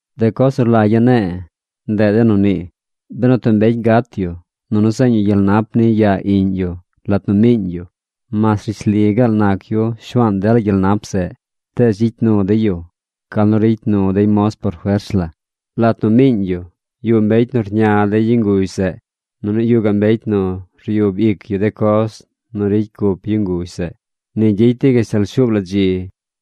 De coz nu rlagya̱ ne̱e̱, ndeꞌ de nu nii: Benu tub mbecy gat yu, nunu zeeñ yu gyel nap niy yaa iꞌñ yu lat nu miiñ yu, mas rishli gaal nac yu shuaan dela gyel nap zeꞌ, tees gyicy nu dey yu gal nu ricy nu dey moz por fers la. Lat nu miiñ yu, yuꞌ mbecy nu rña dey yu nguzh zeꞌ, nunu yuꞌ gaꞌ mbecy nu ryub ic yu de coz nu ricy cup yu nguzh zeꞌ. Ni gyicy dey gashtal shuub la dzi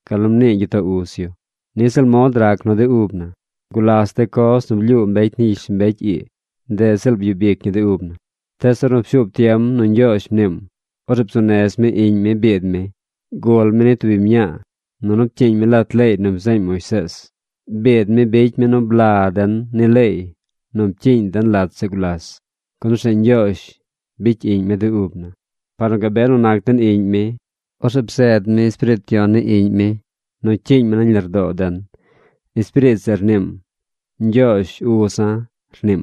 gal nu mnii gyitoo uz yu. Niꞌ ziꞌl mod rac nu de ub na. Gulas de coz nu blyuu mbecy ni gyishlombecy ii, ndeꞌ ziꞌl byub ic ñi de ub na. Tees ornu pshuub tiem nu Ñgyoozh mniim, orzeꞌ bzuu nez mi Iꞌñ mi biid mi. Gul mi ni tub biñ mñaa, nunu pcyiiñ mi lat leey nu bzeeñ Moisees. Biid mi bicy mi nu bla den ni leey nu pcyiiñ den lat zeꞌ gulas, gun orzeꞌ Ñgyoozh bicy iꞌñ mi de ub na. Par nu gabe nu nac den iꞌñ mi, orzeꞌ bzeed mi Espiriit Yon ni Iꞌñ mi nu cyiiñ mi nañ lardoo den. Espiriit zeꞌ rniim: “Ñgyoozh, Uza̱”, rniim.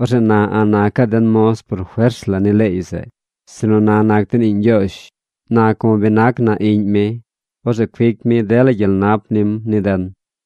Orzeꞌ na a̱ꞌ nacaꞌ den moz por fers ni leey zeꞌ, sinu na nac den iꞌñ Ñgyoozh. Na como bi nac na iꞌñ mi, orzeꞌ cuic mi dela gyel nap nim ni den.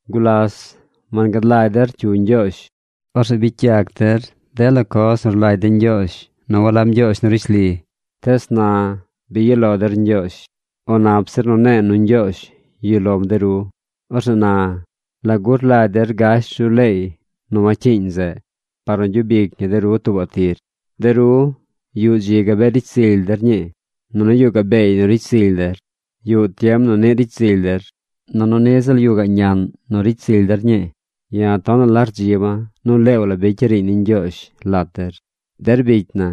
Gulas wangad lagy der cyu Ñgyoozh. Orzeꞌ bicy yac der dela coz nu rlagy de ñgyoozh nu walab ñgyoozh nu rishli. Tees na bi yuꞌ lo der Ñgyoozh. O nap zir nu ne̱e̱ nu Ñgyoozh yuꞌ lom de ru. Orzeꞌ na ¿lagu rlagy der gash ru leey nu wacyiiñ zeꞌ par nu gyub ic ñi de ru tuubaꞌ tir? De ru, yuꞌ dzi gabee ricy zily der ñii. Nunu yuꞌ gaꞌ beey nu ricy zily der. Yuꞌ tiem nu niꞌ ricy zily der. Nunu niꞌ ziꞌl yuꞌ gaꞌ ñaꞌn nu ricy zily der ñii. ¡Ya̱ tonaꞌ la rdziba̱ nu leew la bicya̱ riiñ ni Ñgyoozh lat der! Der bicy na,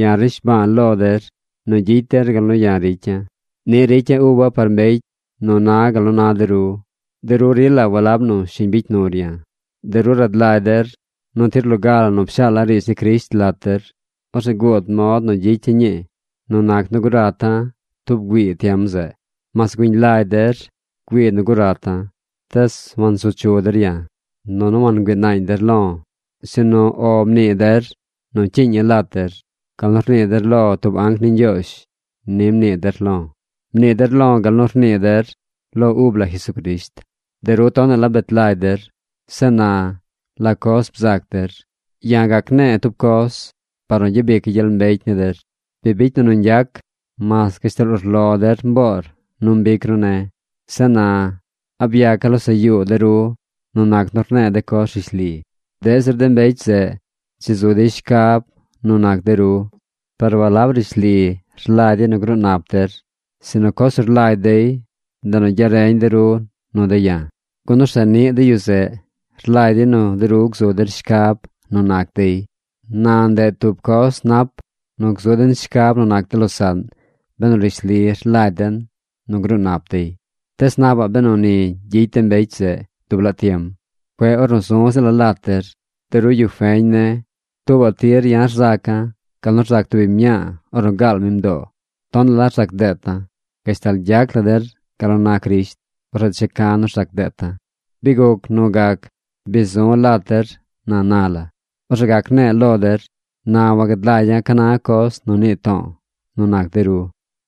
ya̱ rnishbaa lo der nu gyicy der gal nu ya̱ ricya̱. Niꞌ ricya̱ uba̱ par mbecy nu na gal nu na de ru. De ru rila walab nu shiñ bicy nur ya̱. De ru rad lagy der nu tir loga la nu pshaala̱ riidz ni Crisht lat der, orzeꞌ guud mod nu gyicya̱ ñii nu nac nu gurata̱ tub güii tiem zeꞌ. Mas güiñ lagy der güii nu gurata̱, tees wansu chu der ya̱, nunu wangüii naañ der lo̱, sinu “O” mnii der nu cyiiña̱ lat der. Gal nu rnii der lo tub anc ni Ñgyoozh ni mnii der lo̱. Mnii der lo̱ gal nu rnii der lo ub la Jesucrisht. De ru tonaꞌ la bet lagy der. Zeꞌ na, ¿la coz bzac der? Ya̱ gac ne̱e̱ tub coz par nu gyabica̱ gyel mbecy ni der. Bi bicy na nu ñgyac, mas gashtal urlo der mboor nu mbic ru ne̱. Zeꞌ na ¿a byaca̱ losaꞌ yuu der nu nac nu rne̱e̱ de coz rishli? Deꞌ zir de mbecy zeꞌ dzi zu dey shcab nu nac de ru. Par walab nu rishli rlagy dey nu gruu nap der, sinu coz nu rlagy dey, ndeꞌ nu gyareñ de ru nu de̱ ya̱, gun orzeꞌ niꞌ de yu zeꞌ rlagy dey nu de ru gzu der shcab nu nac dey. Na ndeꞌ tub coz nap nu gzu den shcab nu nac de losaꞌn benu rishli rlagy den nu gruu nap dey. Tees napaꞌ benu ni gyicy de mbecy zeꞌ dub laa tiem, cueꞌ ornu zu̱ ziꞌla̱ lat der. De ru yu feñ ne̱, tuubaꞌ tir ya̱ rzaca̱ gal nu rzac tub biñ mñaa ornu gaal mi mdoo. Tonaꞌ la rzac deeta̱. Gashtal gyac la der gal nu na Crisht, orzeꞌ checa̱ nu rzac deeta̱. ¡Bi guc nu gac bi zu̱ lat der na na la, orzeꞌ gac ne̱e̱ lo der! ¡Na wagad lagya̱ ca na coz nu nii to̱o̱ nu nac de ru!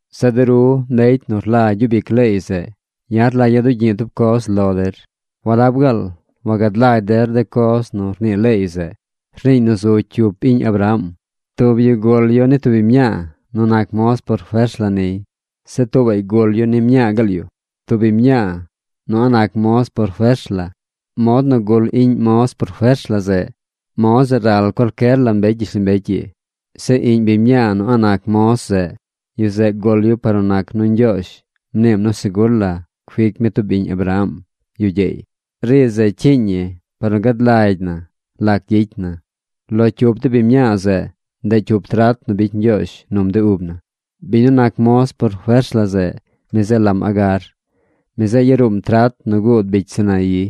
Zeꞌ de ru, mbecy nu rlagy gyub ic leey zeꞌ, ya̱ rlagya̱ dugyi̱ꞌ tub coz lo der: ¿walab gaal wagad lagy der de coz nu rnii leey zeꞌ? Rniiñ nu zu cyup iꞌñ Abraham. Tub yu gul yu ni tub biñ mñaa nu nac moz por fers la niy. Zeꞌ tuubaꞌy gul yu ni mñaa gaal yu, tub biñ mñaa nu a̱ꞌ nac moz por fers la. Mod nu gul iꞌñ moz por fers la zeꞌ, mod zeꞌ ral cualcyer la mbecy gyishlombecy ii. Zeꞌ iꞌñ biñ mñaa nu a̱ꞌ nac moz zeꞌ, yu zeꞌ gul yu par nu nac nu Ñgyoozh mniim nu segur la cuic mi tub iꞌñ Abraham yu gyeey. Riidz zeꞌ cyiiñ ñi par nu gad lagy na lac gyicy na. Lo cyup de biñ mñaa zeꞌ, ndeꞌ cyup trat nu bicy Ñgyoozh num de ub na. Biñ nu nac moz por fers la zeꞌ, mi zeꞌ lam Agar. Mi zeꞌ yaruum trat nu guud bicy Sinaí.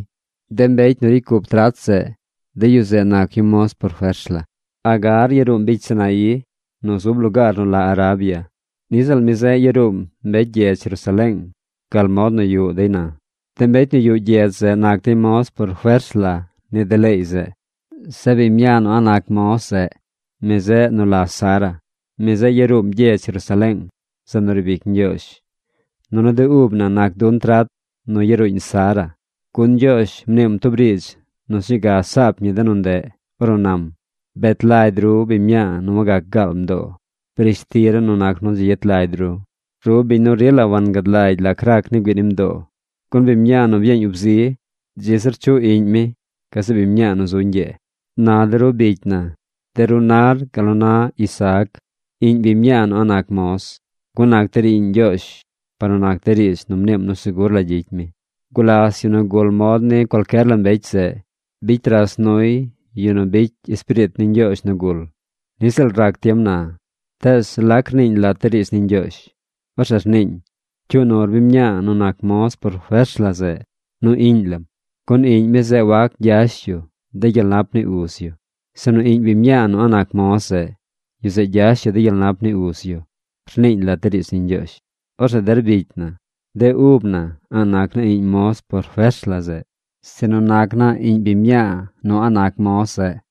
De mbecy nu ricy cup trat zeꞌ, de yu zeꞌ nac yu moz por fers la. Agar yaruum bicy Sinaí nu zub lugaar nu la Arabia. Niꞌ ziꞌl mi zeꞌ yaruum mbecy gyedz Jerusaleeng gal mod nu yuꞌ dey na. De mbecy nu yuꞌ gyedz zeꞌ nac dey moz por fers la ni de leey zeꞌ. Zeꞌ biñ mñaa nu a̱ꞌ nac moz zeꞌ, mi zeꞌ nu la Sara. Mi zeꞌ yaruum gyedz Jerusaleeng, zeꞌ nu riib ic Ñgyoozh, nunu de ub na nac dun trat nu yaruuñ Sara. Gun Ñgyoozh mniim tub riidz nu sñuu ga saap ñi de nu ndeꞌ ornu nam: Bet lagy ru biñ mñaa nu wagac gaal mdoo. Brish ti la nu nac nu dzi yet lagy ru, ru biñ nu rila wangad lagy lac rac ni güii ni mdoo. Gun biñ mñaa nu byeeñ ub zi, dzi zir chuꞌ iꞌñ mi gazeꞌ biñ mñaa nu zu ñgyee. Na de ru bicy na, de ru nar gal nu na Isaac, iꞌñ biñ mñaa nu a̱ꞌ nac moz, gun nac der iꞌñ Ñgyoozh par nu nac de riidz nu mniim nu segur la gyicy mi. Gulas yu nu gul mod ni cualcyer la mbecy zeꞌ bicy ras nuy yu nu bicy Espiriit ni Ñgyoozh nu gul. Niꞌ ziꞌl rac tiem na. Tees ¿lac rniiñ lat de riidz ni Ñgyoozh? Orzeꞌ rniiñ: “Cyuu nur biñ mñaa nu nac moz por fers la zeꞌ nu iꞌñ lam. Gun iꞌñ mi zeꞌ wac gyash yu de gyel nap ni uz yu, sinu iꞌñ biñ mñaa nu a̱ꞌ nac moz zeꞌ, yu zeꞌ gyash yu de gyel nap ni uz yu”, rniiñ lat de riidz ni Ñgyoozh. Orzeꞌ der bicy na, de ub na a̱ꞌ nac naa iꞌñ moz por fers la zeꞌ, sinu nac naa iꞌñ biñ mñaa nu a̱ꞌ nac moz zeꞌ.